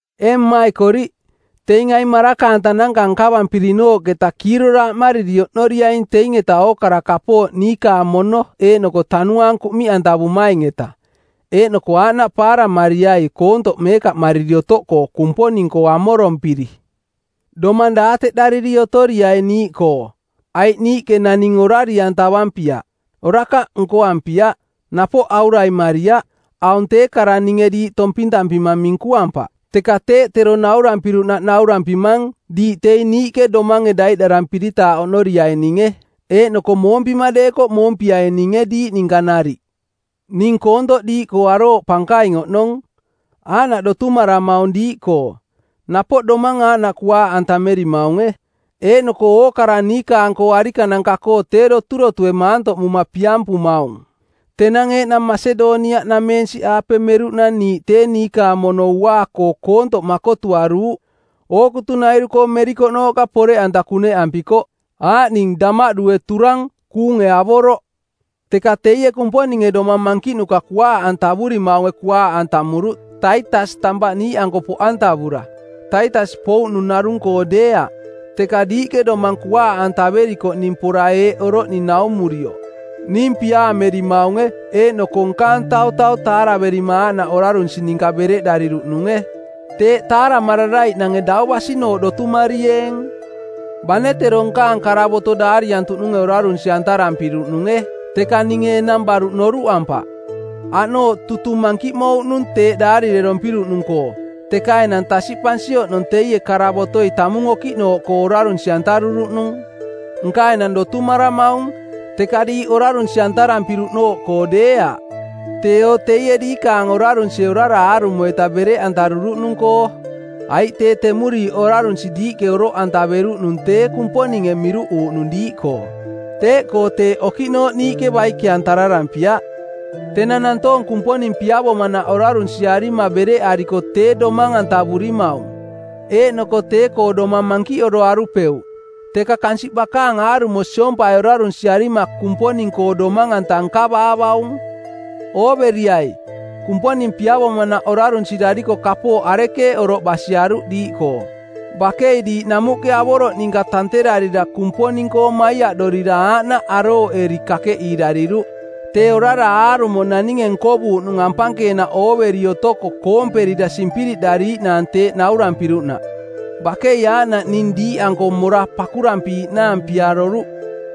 Ee mmaikoriꞌ, teing aing maraka-antananka nkavampirinooꞌketa kiiroraaꞌmariri oꞌnoriaing teing-eta ookara kapooꞌ niikaang mono eeꞌnoko tanuaang kuꞌmiꞌantavumaing-eta, eeꞌnoko aaꞌnaꞌ paaramariai koontoꞌ meekaꞌmariri otoꞌkoo Kumponing-koo amorompiri. Domang daateꞌdariri otoriai niiꞌkoo, aiꞌ niiꞌke naning orari-antavampiaꞌ; orakaꞌ nkoampiaꞌ; napoꞌ auraimariaꞌ. Aung tee kara ninge diiꞌ tompintampima minkuampaꞌ, teka teeꞌ tero naurampiruꞌnaꞌ naurampimang diiꞌ teing niiꞌke domange daiꞌdarampiritaaꞌ oꞌnoriaininge, eeꞌnoko moompima deekoꞌ moompiaininge diiꞌ ninka nariꞌ. Ning koontoꞌ diiꞌkoo arooꞌ pankaing oꞌnong. Aaꞌnaꞌ doturotumaramaung diiꞌkoo. Napoꞌ domang aaꞌnaꞌ kuaaꞌantamerimaunge. Eeꞌnoko ookara niikaang-koo arikananka-koo tee doturotue maantoꞌmuma piampumaung. Tenang eeꞌnang Masedoniaꞌnameensiꞌaape meruꞌnang niiꞌ tee niikaang mono uaa-koo koontoꞌ makotuaruuꞌ. Ookutunairu-koo merikoꞌnooꞌka poreꞌanta kuneꞌampikoꞌ, aaꞌning damaꞌdue turang, kuunge avoroꞌ. Teka teie Kumponinge domang mankiꞌnuka kuaaꞌantavurimaunge kuaaꞌantamuruꞌ Taitas tampaꞌ niiꞌanko poꞌantavura. Taitas pouꞌnung narung-koo deeaꞌ, teka diiꞌke domang kuaaꞌantaverikoꞌning pora eeꞌ oroꞌning naumurioꞌ: ning piaamerimaunge eeꞌnoko nkaang tautau taaraverima aaꞌnaꞌ orarunsi ninka bereꞌdariruꞌnunge. Teeꞌ taaramararaiꞌnange dau basinooꞌ dotumarieeng! Bane tero nkaang karavoto daariantuꞌnunge orarunsi-antarampiruꞌnunge, teka ninge enang baruꞌ noruꞌampaꞌ. Aꞌnooꞌ tutung mankiꞌmouꞌnung teeꞌ daarirerompiruꞌnung-koo, teka enang tasiꞌpansi oꞌnong teie karavotoi tamung okiꞌnooꞌkoo orarunsi-antaruruꞌnung. Nka enang dotumaramaung, teka diiꞌ orarunsi-antarampiruꞌnooꞌkoo deeaꞌ, teeo teie diikaange orarunsie orara aarumo-ita bereꞌantaruruꞌnung-koo. Aiꞌ tee temuriiꞌ orarunsi diiꞌke oroꞌantaveruꞌnung tee Kumponinge miruꞌuuꞌnung diiꞌkoo. Teeꞌkoo teeꞌ okiꞌnooꞌ niiꞌke baike-antararampiaꞌ. Tenang nantoong Kumponing piavomanaꞌ orarunsiarima bereꞌariko tee domang-antavurimaung, eeꞌnoko tee-koo domang mankiꞌoroarupeuꞌ, teka kansiꞌ bakaang aarumo siompai orarunsiarima Kumponing-koo domang-anta nkavaavaung. Ooveriai, Kumponing piavomanaꞌ orarunsirariko kapooꞌ arekeeꞌ oroꞌ basiaruꞌ diiꞌkoo. Bakei diiꞌ namuꞌke avoroꞌ ninka tanterarira Kumponing-koo maiaꞌdorira aaꞌnaꞌ arooꞌeri kakeꞌiirariruꞌ tee orara aarumo naninge nkovuuꞌnung ampankeenaꞌ ooveri otoko koomperira simpiriꞌdariiꞌnaang teeꞌ naurampiruꞌnaꞌ. Bakei aaꞌnaꞌ ning diiꞌanko mora pakurampiiꞌnaang piaroruꞌ.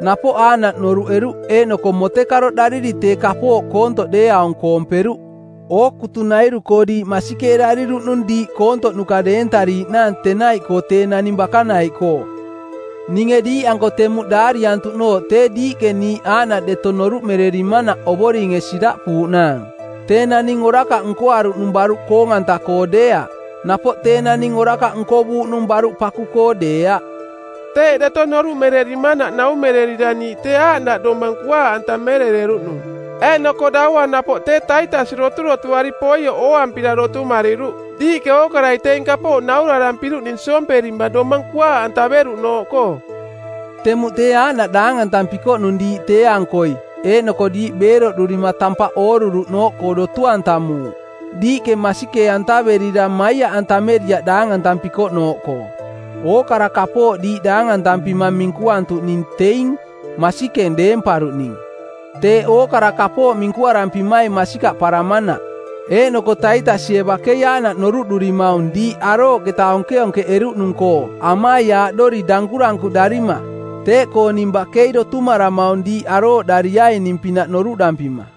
Napoꞌ aaꞌnaꞌ noruꞌeruꞌ eeꞌnoko motekaroꞌdariri tee kapooꞌ koontoꞌ deeaung koomperuꞌ. Ookutunairu-koo diiꞌ masikeerariruꞌnung diiꞌ koontoꞌnuka deentariiꞌnaang tenaiꞌkoo tee naning bakanaiꞌkoo. Ninge diiꞌanko temuꞌ daariantuꞌnooꞌ tee diiꞌke niiꞌ aaꞌnaꞌ deto noruꞌmererimanaꞌ Ovoringe siraꞌpuuꞌnaang. Tee naning orakaꞌ nkoaruꞌnung baruꞌ koong-anta-koo deeaꞌ, napoꞌ tee naning orakaꞌ nkovuuꞌnung baruꞌ paku-koo deeaꞌ. Teeꞌ deto noruꞌmererimanaꞌ naumererira niiꞌ tee aaꞌnaꞌ domang kuaaꞌantamerereruꞌnung. Eeꞌnoko daua napoꞌ tee Taitas doturotuari poioꞌ ooampira dotumariruꞌ diiꞌke ookarai teing kapooꞌ naurarampiruꞌning siomperima domang kuaaꞌantaveruꞌnooꞌkoo. Temuꞌ tee aaꞌnaꞌ daangantampikoꞌnung diiꞌ tee-ankoi eeꞌnoko diiꞌ beeroꞌdurima tampaꞌ ooruruꞌnooꞌkoo dotu-antamuuꞌ. Diiꞌke masikee-antaverira maiaꞌantameriaꞌ daangantampikoꞌ nooꞌkoo. Ookara kapooꞌ diiꞌ daangantampima minkuantuꞌning teing masikeng deemparuꞌning teeꞌ ookara kapooꞌ minkurampimaing masikaꞌparamanaꞌ. Eeꞌnoko Taitasie bakei aaꞌnaꞌ noruꞌdurimaung diiꞌ arooꞌketa onkeonkeꞌeruꞌnung-koo amaiaaꞌdori dankurankuꞌdarima. Teeꞌkoo ning bakei dotumaramaung diiꞌ arooꞌdariaining-pinaꞌ noruꞌdampima.